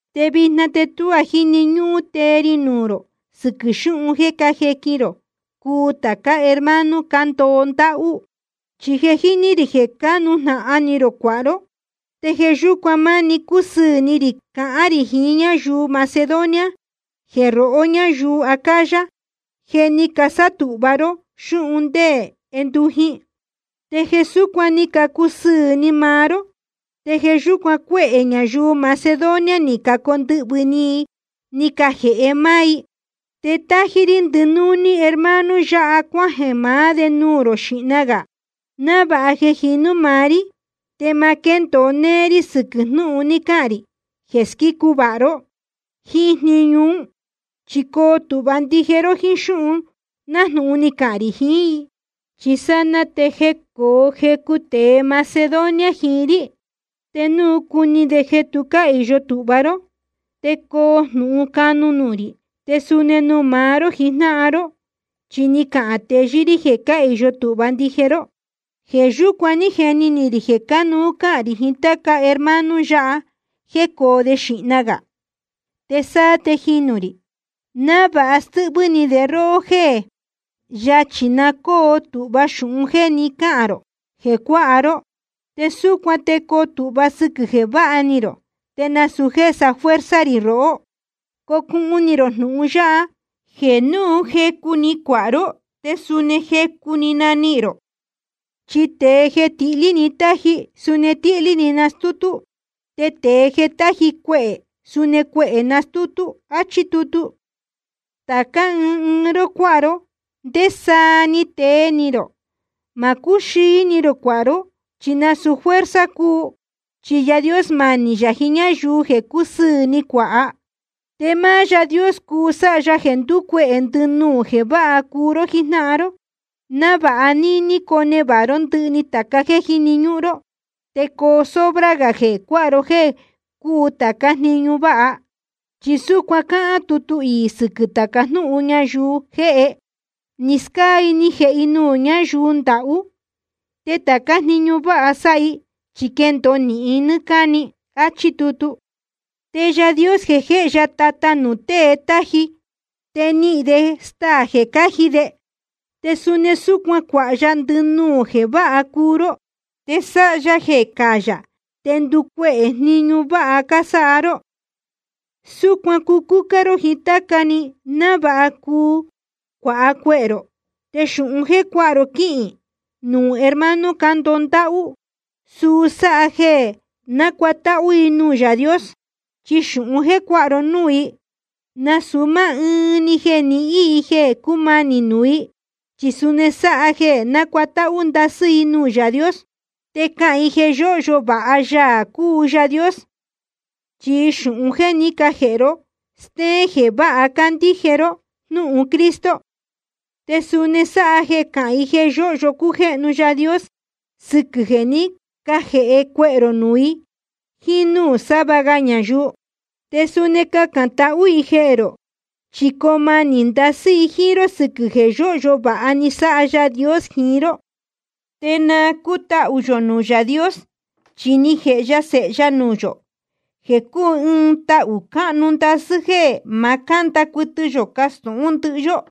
Te vijna te tuá jíni ñúhún tee ri nuū rō sɨquɨ̄ xúhun jeē cájequin rō cuu tācá hermano cándoho ndáhú. Chi je jíní rī jeē cánujnahan ni rō cuāha ró. Te jeē yúcuan máni cúsɨɨ̄ ni rī cahán rī jiín ñáyuu Macedonia jeē rohó ñáyuu Acaya, je ni casátūhva ró xúhun ndé jendujin. Te jeē súcuan ni cacusɨɨ̄ ni maá ró, te jeē yúcuan cuehē ñayuu Macedonia ni cacondɨhvɨ̄ ni i ni cajēhe máá i. Te tájí rí ndɨnúní hermano yáha cuájeē maá de nuū rō xīhna gā, návāha jeē jinú maá rí te ma quéndōo néé rí sɨquɨ̄ jnúhun ni cahān rī jeē squícu vāha ró jíín jniñu ún. Chi coo tūhva ndije ró jíín xúhun nájnūhun ni cahān rī jiín i. Chi sanaa te jecoo jecu tēe Macedonia jiín rí, te núu cuni de jeē tu cáhīyo tūhva ró, te coo jnūhun canu nuū rī, te suni nuū maá ró jijnáhan ró, chi ni cahān teyɨ́ rí jeē cáhīyo tūhva ndije ró. Jeē yúcuan ní jeni ni rī jeē cánuú cahān rī jiín táca hermano yáha jecoo de xīhna gā, te sáá te jinū rī, návāha stɨ́hvɨ́ ni de róhó jéē yáchī na cóo tūhva xūhun jéē ní cacahān rō jeē cuáha ró. Te súcuan te coo tūhva sɨquɨ̄ jeē váha ni rō, te nasūu jéē safuerza rī rohó. Cocuhun ni rō jnūhun yáha, jeē núu jecu‑ni cuāha ró te suni jecu‑ni nanihīn rō: Chi tēe jeē tihlí‑ni táji, suni tíhlí‑ni nastútú. Te tēe jeē táji cuehē, suni cuehē nastútú. Achí tutu. Tācá ɨɨn ɨɨn ró cuāha ró ndésaa ni tee ni rō. Ma cúxīi ni rō cuāha ró, chi nasūu fuerza cúu. Chi Yaā Dios manī yā jiín ñáyuu jeē cúsɨɨ̄ ni cuāha. Te máá Yaā Dios cuu sáha ya jeē nducuehē ndɨnuū jeē váha cuu ró jíjnáhan ró, návāha níní conevāha ró ndɨhɨ tācá jeē jíni ñúhún ró, te coo sobra gā jeē cuāha ró jéē cúu tācá jniñu váha. Chi súcuan cáhán tutu iī sɨquɨ̄ tāca ñáyuu jéhe: Ni scáa i ni jēhe i nuū ñáyuu ndahú. Te tācá jniñu váha sáha i, chi quendōo nɨ́ɨ́ cáni. Achí tutu. Te Yaā Dios jéhe ya tata nuū tēe táji, te nihīn de staā jeē cáji de. Te suni súcuan cuāha ya ndɨnuū jeē váha cuu ró, te sáha ya jeē cáyā te nducuehē jniñu váha cásáha ró. Súcuan cucúcá ró jiín táca‑ni, návāha cuu cuāha cuehē rō. Te xūhun jéē cuáha ró quíhīn nuū hermano cándoho ndáhú, suu sáha jeē nácuatáhú i nuū Yaā Dios. Chi xūhun jéē cuáha ró núū i, nasūu máá ɨɨn‑ni jeē nihín i jeē cúmanī nuū i, chi suni sáha jeē nácuatáhú ndasɨ́ i nuū Yaā Dios. Te cahān i jeē yóhyo vāha Yaā cúu Yaā Dios, chi xūhun jéē ní cajēhe ró stéén jeē váha cácandíje ró jnúhun Cristo. Te suni sáha jeē cahān i jeē yóhyo cújéhnu Yaā Dios sɨquɨ̄ jeē ní cajēhe cuehē rō nuū i jíín núū sava ga ñayuu. Te suni cacān tahú i jehē rō, chi coo manī ndasɨ́ i jíín ró sɨquɨ̄ jeē yóhyo vāha ni sáha Yaā Dios jiín ró. Te na cútahū yō nuū Yaā Dios, chi ni jēhe ya Sēhe ya nuū yō, jeē cúu ɨɨn tahū cáhnu ndasɨ́ jéē ma cánda cuɨtɨ yō castūhún ndɨhɨ yó.